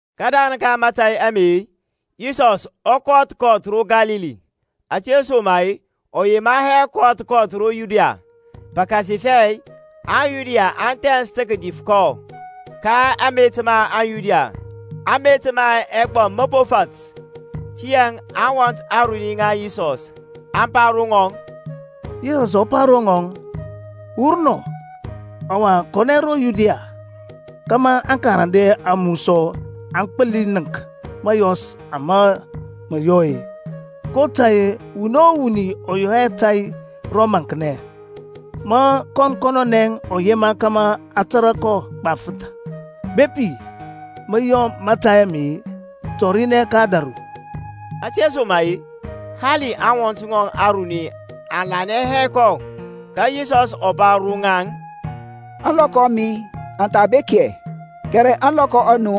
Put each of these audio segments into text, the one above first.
Kədarəŋ ka mȧtȧy ame-e, Yisɔsȧŋ ɔ kɔth kɔth ro Kalili; ȧtesoma-e ɔ yema hɛ kɔth kɔth ro Yudia, pəkasifɛ aŋYuda aŋ thɛns tə kədif kɔ. Ka amet ma aŋYuda, amet ma ɛgbɔm mə fat. Tiyȧŋ aŋwɔnt aruni ŋa Yisɔs aŋ pa ro ŋɔŋ, Wur nɔ, ɔwa kɔnɛ ro Yudia, kȧmȧ aŋkarande a mu sɔ aŋ gbəli nənk mȧyɔs ama mə yɔ-e. kotȧy-e wuni o wuni ɔ yɔ hɛ tȧy ro maŋknɛ, ma kɔn kɔnɔnɛ ɔ yema kȧmȧ a tȧrȧ kɔ gbafəth. Bepi mə yɔ mȧtȧy ame, tɔrinɛ ka ȧdȧru. Ȧtesoma-e hali aŋwɔnt ŋɔŋ aruni aŋ lanɛ hɛ kɔ. Ka Yisɔsȧŋ ɔ pa ro ŋaŋ, Ȧŋlɔkɔ a mi aŋ tha bek hɛ, kɛrɛ ȧŋlɔkɔ a nu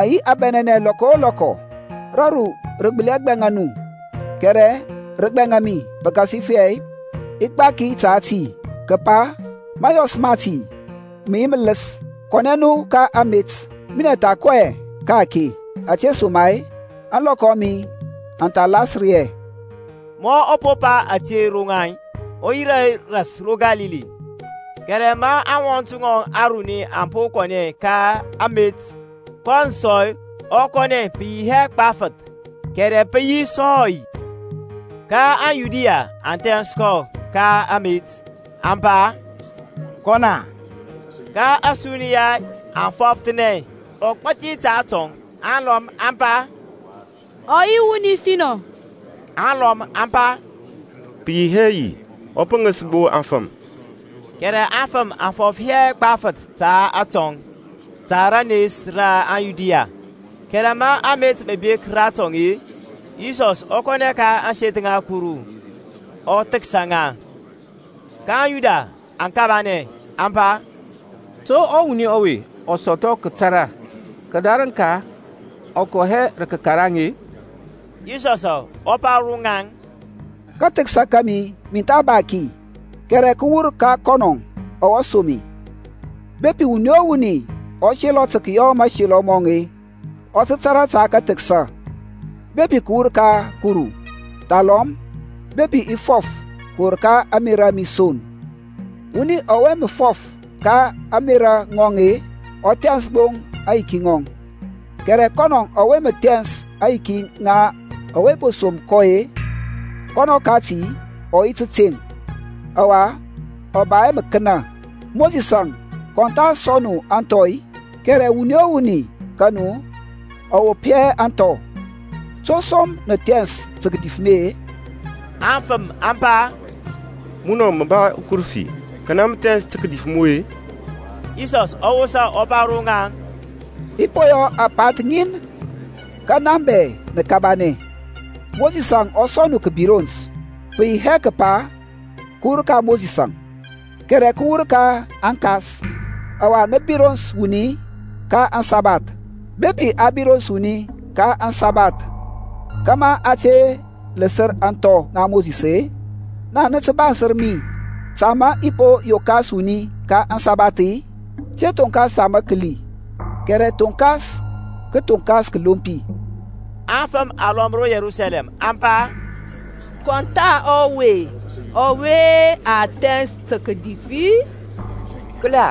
aŋ yi abɛnɛnɛ lɔkɔ o lɔkɔ. Raru rə gbəli hɛ gbɛŋa nu; kɛrɛ rə gbɛŋa mi, pəkasifɛ i gbaki ta ti kəpa mȧyɔs mati mə yi mələs. Kɔnɛ nu ka amet; minɛŋ i tha kɔ hɛ ka-ake, ȧtesoma-e ȧŋlɔkɔ a mi aŋ tha lasər hɛ. Ma ɔ po pa ȧte ro ŋaŋ ɔ yirȧ ras ro Kalili. Kɛrɛ ma aŋwɔnt ŋɔŋ aruni aŋ po kɔnɛ ka amet-e, kɔnɔŋ sɔ ɔ kɔnɛ pə yi hɛ gbafəth, kɛrɛ pə yi gbo sɔy. Ka aŋYuda aŋ thɛns kɔ ka amet, aŋ pa, Kɔn-a? Ka ȧsuniya aŋ fɔfəthanɛ ɔgbȧthi ta atɔŋ: alɔm aŋ pa, Ɔ yi wuni finɔ; alɔm aŋ pa, Pə yi hɛ yi, ɔ pəŋis gbo afəm. Kɛrɛ aŋfəm aŋ fɔf hɛ gbafəth ta atɔŋ ta rənes ra aŋYuda-e. Kɛrɛ ma amet mə bek ratɔŋ-e, Yisɔsȧŋ ɔ kɔnɛ ka ȧŋseth ŋa Kuru, ɔ thəksa ŋa. Ka aŋYuda aŋ kabanɛ, aŋ pa, To ɔwuni ɔwe ɔ sɔthɔ kətara, kədarəŋ kɔ kɔ hɛ rə kəkaraŋ-e? Yisɔsȧŋ ɔ pa ro ŋaŋ, Kathəksa kȧmi min tha ba ki, kɛrɛ kə wur ka kɔnɔ ɔwe som mi. Bepi wuni o wuni ɔ selɔ tə kəyɔ mȧselɔ mɔŋ-e, ɔ tə tȧrȧ ta kathəksa, bepi kə wur ka Kuru, thalɔm bepi i fɔf kəwur ka ȧŋmerȧ a mi son. Wuni ɔwe mə fɔf ka ȧŋmerȧ ŋɔŋ-e, ɔ thɛns gbo aŋyiki ŋɔŋ: kɛrɛ kɔnɔŋ ɔwe mə thɛns aŋyiki ŋa ɔwe po som kɔ-e, kɔnɔ kati ɔ yi təteŋ, ɔwa ɔ ba hɛ məkənə. Mosisȧŋ kɔn tha sɔŋ nu anthɔ-i? Kɛrɛ wuni o wuni ka nu ɔ wop hɛ ȧŋthɔ. To som nə thɛns tə kədif mi-e? Aŋfəm aŋ pa, Munɔ mə ba ukərəfi; kanɛ mə thɛns tə kədif mu-e? Yisɔsȧŋ ɔ wosa, ɔ pa ro ŋaŋ, I po yɔ apanth ŋin, ka na bɛ nə kabanɛ. Mosisȧŋ ɔ sɔŋ nu kəbirons [pə yi hɛ kəpa kə wur ka Mosisȧŋ, kɛrɛ kə wur ka aŋkas] ɔwa nə birons wuni ka aŋsabath. Bepi a birons wuni ka aŋsabath, kȧmȧ a te ləsər ȧŋthɔ ŋa Mosis-e, naŋ nə tə bansər mi, ta ma i po yenkəs wuni ka ȧŋsabath-i? Te thonkas ta məkəli, kɛrɛ thonkas kəthoŋkas kəlompi. Aŋfəm alɔm ro Yerusalɛm aŋ pa, Kɔn tha ɔwe ɔwe ma thɛns tə kədif-i? Kəla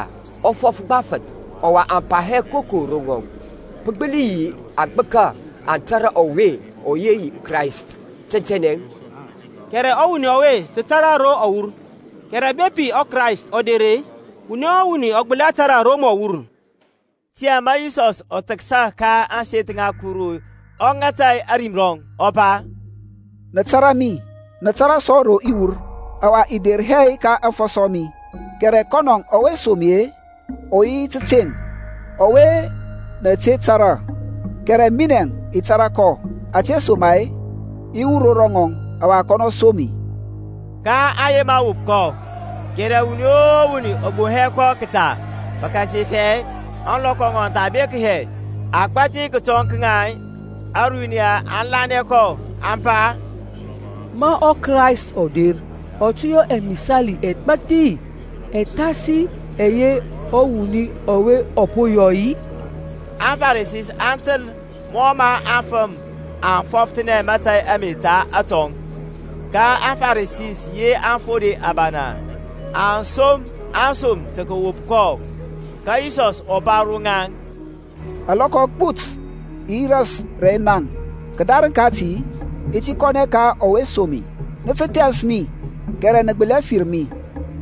ɔ fɔf gbafəth, ɔwa aŋ pa hɛ koko ro ŋɔŋ. Pə gbəli yi aŋgbəka aŋ tȧrȧ ɔwe ɔ yi ɔKrayst tɛntɛnɛ-i? Kɛrɛ ɔwuni ɔwe sə tȧrȧ ro ɔ wur; kɛrɛ bepi ɔKrayst ɔ der, wuni o wuni ɔ gbəli hɛ tȧrȧ ro mɔ wur. Tiyȧŋ ma Yisɔsȧŋ ɔ thəksa ka ȧŋseth ŋa Kuru ɔ ŋata ȧrim rɔŋ, ɔ pa, Nə tȧrȧ mi, nə tȧrȧ sɔ ro i wur: ɔwa i der hɛ ka aŋfɔsɔ a mi, kɛrɛ kɔnɔ ɔwe som mi-e ɔ yi tȧteŋ, ɔwe nə te tȧrȧ. Kɛrɛ minɛŋ i tȧrȧ kɔ, ȧtesoma-e i wur ro ŋɔŋ, ɔwa kɔnɔ som mi. kaŋ yema wop kɔ: kɛrɛ wuni o wuni ɔ gboŋ hɛ kɔ kəta, pəkasifɛ ȧŋlɔkɔ ŋɔŋ aŋ tha bek hɛ. Agbathi kətɔŋ ka ȧruniya aŋ lanɛ kɔ, aŋ pa, Ma ɔKrayst ɔ der ɔ tə yɔ ɛmisali ɛgbathi ɛ thasi ɛyɛ ɔwuni ɔwe ɔ po yɔ-i? AŋFarisi aŋ təl mɔ mə aŋfəm aŋ fɔfəthanɛ mȧtȧy ame ta atɔŋ; ka aŋFarisi yi aŋfode abana aŋ som asom tə kəwop kɔ. Ka Yisɔsȧŋ ɔ pa ro ŋaŋ, Alɔkɔ agbut i yi ras rɛ naŋ, kədarəŋ kati i ti kɔnɛ ka ɔwe som mi. Nə tə thɛns mi, kɛrɛ nə gbəli hɛ fir mi: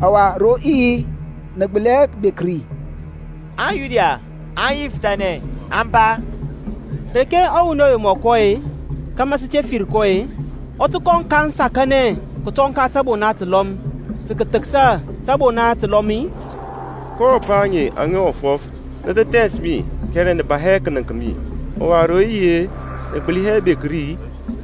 ɔwa ro i yi, nə gbəli hɛ bek ri. AŋYuda aŋ yifəthanɛ, aŋ pa, Reke ɔwuni ɔwe ɔ tə kɔ-e, kȧmȧ sə te fir kɔ-e, ɔ tə kɔ kaŋ sakanɛ kətɔŋ ka tȧbona təlɔm, tə kəthəksa tȧbona təlɔm-i? Ko apa aŋe aŋa ɔ fɔf, Nə tə thɛns mi kɛrɛ nə ba hɛ kənəŋk mi: ɔwa ro i yi, nə gbəli hɛ bek ri-e?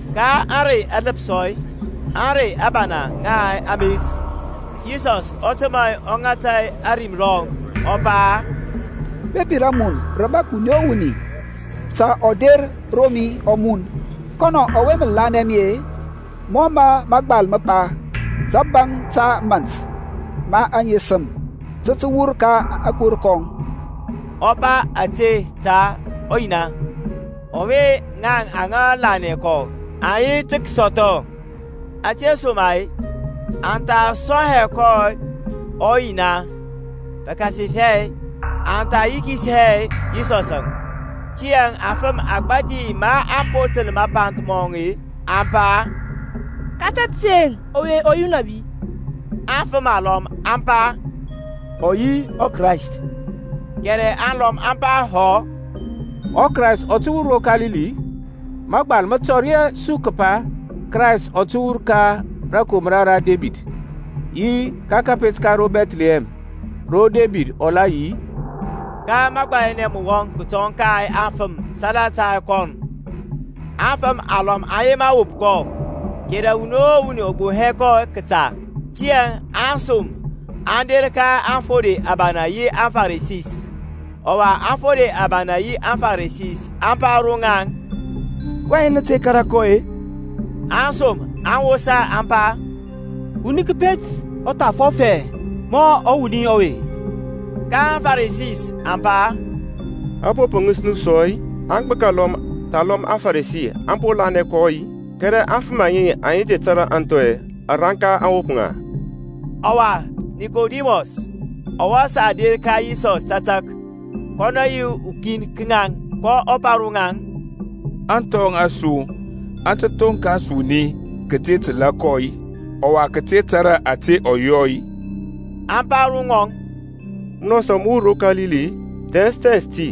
Ka ȧŋrey aləpsɔ, ȧŋrey abana ŋa amet, Yisɔsȧŋ ɔ təmȧ ɔ ŋata ȧrim rɔŋ, ɔ pa, Bepi ramun rə bȧk wuni o wuni, ta ɔ der ro mi ɔ mun. Kɔnɔ ɔwe mə lanɛ mi-e, mɔ mə mȧgbal mə pa, təbaŋ ta mȧnt ma aŋesəm tə tə wur ka akor kɔŋ. Ɔ pa ȧte ta ɔYina, ɔwe ŋaŋ aŋa lanɛ kɔ aŋ yi tə kəsɔthɔ: ȧtesoma-e a tha sɔŋ hɛ ɔYina, pəkasifɛ a tha yikis hɛ Yisɔsȧŋ. Tiyȧŋ afəm agbȧthi maŋ po təl mapa mɔŋ-e, aŋ pa, Ka tȧteŋ ɔwe ɔ yi ɔnȧbi. Afəm alɔm aŋ pa, Ɔ yi ɔKrayst. Kɛrɛ alɔm aŋ pa, Hɔ, ɔKrayst ɔ tə wur ro Kalili-i? Magbal mə tɔri hɛ su kəpa ɔKrayst ɔ tə wur ka rȧkomra ra Debid, yi ka kȧpet ka ro Bɛthlihɛm, ro Debid ɔ la yi-i? Ka məgbayanɛ mə wɔŋ kətɔŋ ka aŋfəm salata kɔnɔŋ. Afəm alɔm aŋ yema wop kɔ; kɛrɛ wuni o wuni ɔ gboŋ hɛ kɔ kəta. Tiyȧŋ asom aŋ der ka aŋfode abana yi aŋFarisi. Ɔwa aŋfode abana yi aŋFarisi aŋ pa ro ŋaŋ, kɔyɛŋ nə te kȧrȧ kɔ-e? Aŋsom aŋ wosa aŋ pa, Wuni kəpet ɔ tha fɔf hɛ mɔ ɔwuni ɔwe. Ka aŋFarisi aŋ pa, A po pəŋis nu sɔ-i? Agbəka alɔm thalɔm aŋFarisi aŋ po lanɛ kɔ-i? Kɛrɛ aŋfəm aŋe aŋa te tȧrȧ ȧŋthɔ, ȧranka aŋ wop ŋa. Ɔwa Nikodimɔs ɔwe sa der ka Yisɔs tȧtȧk kɔnɔ yi ukin ka ŋaŋ, kɔ pa ro ŋaŋ, Ȧŋthɔ a su aŋ tə thonkas wuni kəte təlȧ kɔ-i, ɔwa kəte tȧrȧ ȧte ɔ yɔ-i? Aŋ pa ro ŋɔŋ, Munɔ sɔ mə wur ro Kalili-i? Thɛns thɛns ti,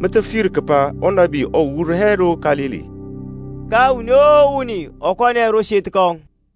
mə tə fir kəpa unabi ɔ wur hɛ ro Kalili. Ka wuni o wuni ɔ kɔnɛ ro seth kɔŋ.